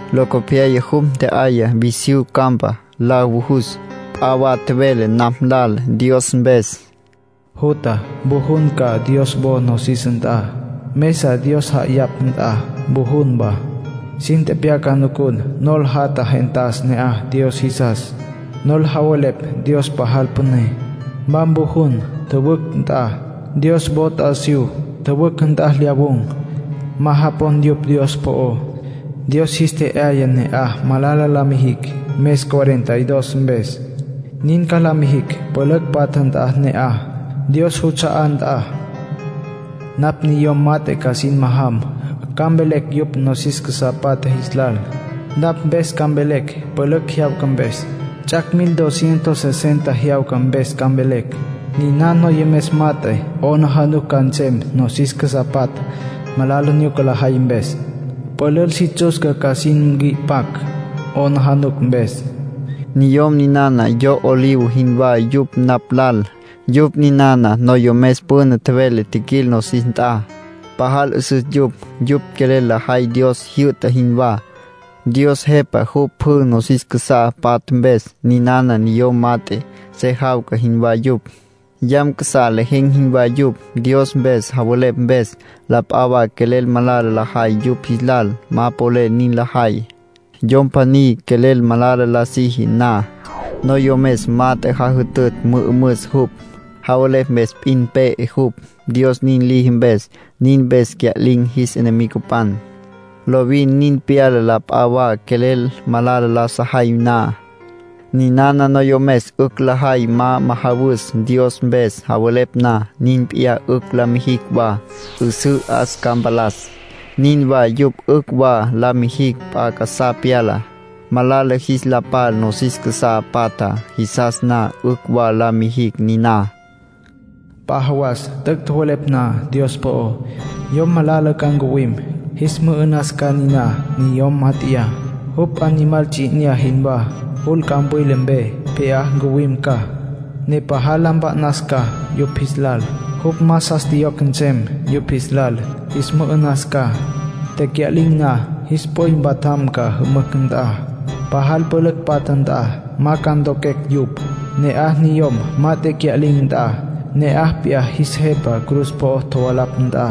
Locopyaya jupj ntje'aya visyú campa, la vujus. P'a wa tjevele napj lal Dios mpes: “Jutja, mvujun ca Dios wo nosis nt'a, mesa Dios ja'ayapj nt'a mvujun wa. Sin tepyaca nucun nol jatja gentas ne'aj Dios jisas, nol javelepj Dios pajal püné. Ma mvujun tjüwücj nt'a, Dios wo t'asiyú. Tjüwücj nt'a lyawun̈, ma japon yupj Dios po'ó. Dios jis tje'yaya ne'aj malala la mijicj mes cuarenta y dos mpes. Nin ca la mijicj pülücj patja nt'a ne'aj, Dios juts'a'á nt'a. ”Napj niyom mat'e ca sin majam, ca mvelecj yupj nosis casá patja jis lal. Napj mpes ca mvelecj, pülücj jyawca mpes; ts'ac' mil, dos cientos sesenta jyawca mpes ca mvelecj. Niná niyom mat'e 'aplijila ca nsem nosis casá patja malala nyuca lajay mpes. Pülül si tsutsca ca sin nqui'pacj, 'aplijila mpes. Niyom ninana yo olivo jinwá yupj napj lal. Yupj ninana noyomes püna tjevelé jiquil nosis nt'a. Pajal 'üsüs yupj. Yupj quelel lajay Dios jyü'ta jinwá. Dios Jepa jupj pjü nosis casá patja mpes. Ninana niyom mat'e, se jawca jinwá yupj, yam casá lejen̈ jinwá yupj, Dios mpes javelepj mpes. La p'a wa quelel malala lajay yupj jis lal, ma polel nin lajay. Yom pjaní quelel malala la siji na, noyomes mat'e jajütütj mü'ümüs jupj. Javelepj mpes p'in pe'e jupj, Dios nin liji mpes. Nin mpes cya'lin̈ jis enemigopan. Lovin nin pyala la p'a wa quelel malala la sajay na. Ninana noyomes 'ücj lajay ma majawus Dios mpes javelepj na. Nin p'iyá 'ücj la mijicj wa, 'üsǘ 'as ca mpalas. Nin wa yupj 'ücj wa la mijicj p'a casá pyalá, malala jis la pal nosis casá patjá. Jisas na, 'ücj wa la mijicj niná. ”P'a jawas t'üc' tjowelepj na Dios po'ó, yom malala ca ncuwim, jis mü'ü'nas ca niná niyom mát'eya. Jupj animal ts'i 'inyá jinwá. Jul campwila mpe pje'á ncuwim ca, ne pajal la mpa'nas ca yupj jis lal. Jupj más jas tjiyocj nsem yupj jis lal; jis mü'ü'nas ca. Tecya'lin̈ na, jis p'üy mpatjam ca jümücj nt'a, pajal pülücj patja nt'a. Ma ca ntoquecj yupj. Ne'aj, niyom mat'e cya'lin̈ nt'a, ne'aj p'iyá jis Jepa cruz po'o tjovalapj nt'a.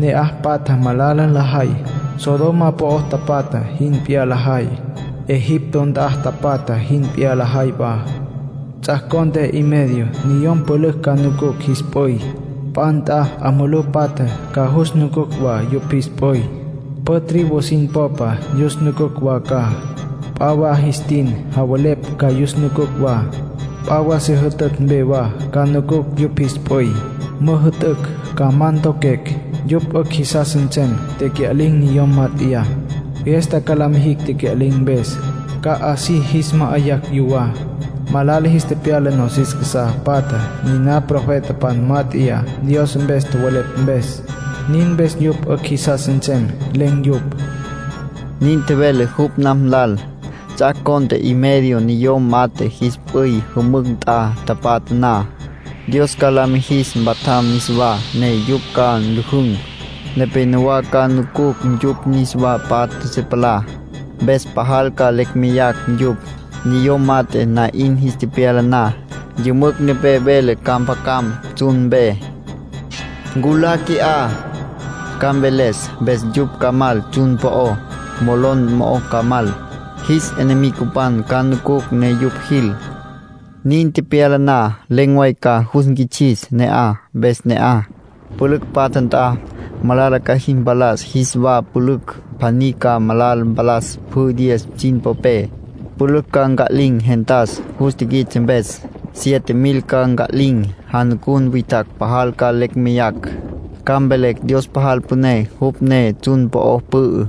Ne'aj patja malala lajay; Sodoma po'o tapatja jin p'iyá lajay, Egipto nt'a tapatja jin p'iyá lajay wa. ”Ts'ac' cont'e y medio niyom pülücj ca nucucj jis p'üy. P'a nt'a 'a mulú patja ca yus nucucj wa yupj jis p'üy. Pjü tribu sin popa yus nucucj wa ca. P'a wa jis tin javelepj ca yus nucucj wa. P'a wa se jütütj mpe wa ca nucucj yupj jis p'üy. Müjü'tücj ca ma ntoquecj. Yupj 'ücj jisas nsem tecya'lin̈ niyom mat'eyá. Fiesta ca la mijicj tecya'lin̈ mpes, ca así jis ma'ayacj yuwá. Malala jis tepyala nosis casá patjá niná profetapan mát'eya Dios mpes tjowelepj mpes. Nin mpes yupj 'ücj jisas nsem len̈ yupj”, nin tjevele jupj napj lal. Ts'ac' cont'e y medio niyom mat'e jis p'üy jümücj nt'a tapatja na, Dios ca la mijis mpatjam niswá, ne yupj ca nlüjün̈. Nepénowa ca nucucj yupj niswa patja se palá, mpes pajal ca lecj meyacj yupj. Niyom mat'e na'in jis tepyala na, yümücj nepé vele ca mpjacam tsjun mpe. “Nculá qui'á”, ca mveles. Mpes yupj ca mal tsjun po'ó, molon mo'ó ca mal. Jis enemigopan ca nucucj ne yupj jil. Nin tepyala na, len̈ way ca jus nquits'is ne'aj, mpes ne'aj, pülücj patja nt'a, malala ca jis mpalas jis wa pülücj. Pjaní ca malala mpalas pjü diez sin popé. Pülücj ca nca'lin̈ gentas, jus tiquits'e mpes. Siete mil ca nca'lin̈. Janucun witjacj pajal ca lecj meyacj, ca mvelecj Dios pajal püné, jupj ne tsjun po'o pü'ü.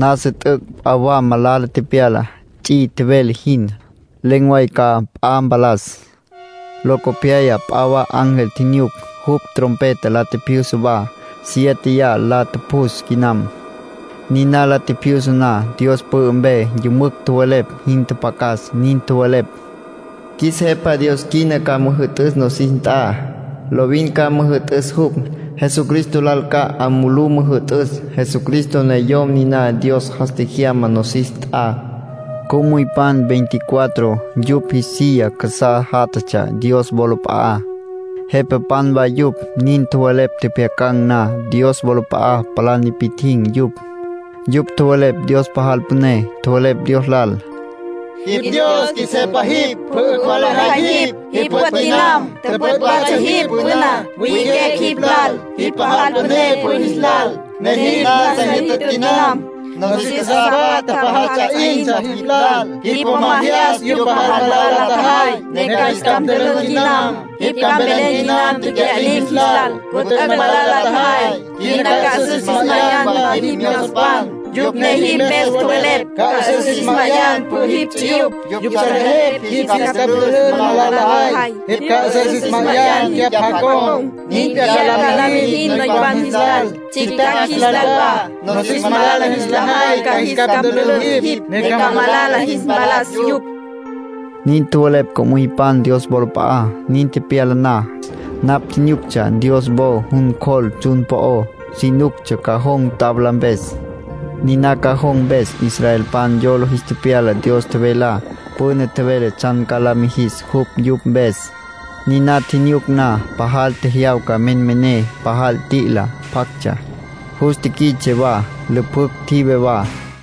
Nasa t'üc' p'a wa malala tepyalá, ts'i tjevele jin. Len̈ way ca p'a mpalas. Locopyaya p'a wa ángel tjinyuc. Jupj trompeta la tjipjyusa wa. Siéteya la tjupjus quinam. Niná la tjipjyusa na, Dios pü'ü mpe yümücj tjowelepj jin tjapjacas. Nin tjowelepj: “Qjuis Jepa Dios quina ca müjü'tüs nosis nt'a. Lovin ca müjü'tüs jupj. Jesucristo lal ca 'a mulú müjü'tücj. Jesucristo ne Yom niná Dios jas tjejyama nosis nt'a”, nin tjowelepj. Co'müypan veinticuatro, yupj jis silla casá játjatsja Dios wolap'a'á. Jepapan wa yupj. Nin tjowelepj tjepjyacan̈ na, Dios wolap'a'a palá nipi'tjin̈ yupj. Yupj tjowelepj Dios pajal püné. Tjowelepj Dios lal: “Jipj Dios. Qjuis Jepa jipj. Pjü 'ücj wa lejay jipj. Jipj püt' quinam. Tüpüt' watsja jipj püná. Wi'iquecj jipj lal, jipj pajal püné pjü jis lal, ne jipj nasa jyütütj quinam. Nosis casá patja pajal ts'a 'intsja jipj lal. Jipj po ma jyas yupj pajal malala la tjajay, ne ca jis capj ntülün quinam. Jipj ca mvelen quinam tecya'lin̈ jis lal, ncu t'üc' malala la tjajay. Quina ca 'üsüs jis ma'ayan wa jipj myozopan, yupj ne jipj mpes tjowelepj. Ca 'üsüs jis ma'ayan pjü jipj ts'uyupj. Yupj salejepj jipj jis capj ntülün malala lajay. Jipj ca 'üsüs jis ma'ayan cyapj jacon̈. Nin p'iyá ca la mijin noypan jis lal, tsjictjacj jis lal wa. Nosis malala jis la jay ca jis capj ntülün jipj, ne ca malala jis mpalas yupj.” Nin tjowelepj co'müypan Dios wolap'a'á. Nin tepyala na, napj tjinyuctsja Dios wo jun cjol tsjun po'ó. Si nuctsja cajón tabla mpes, niná cajón mpes, israelpan yola jis tepyala Dios tjevelá. Püna tjevele tsjan ca la mijis jupj yupj mpes. Niná tjinyuc na, pajal tjejyawca menmené, pajal t'i'ila pjactsja. Jus tiquits'e wa, lüpjücj tjive wa.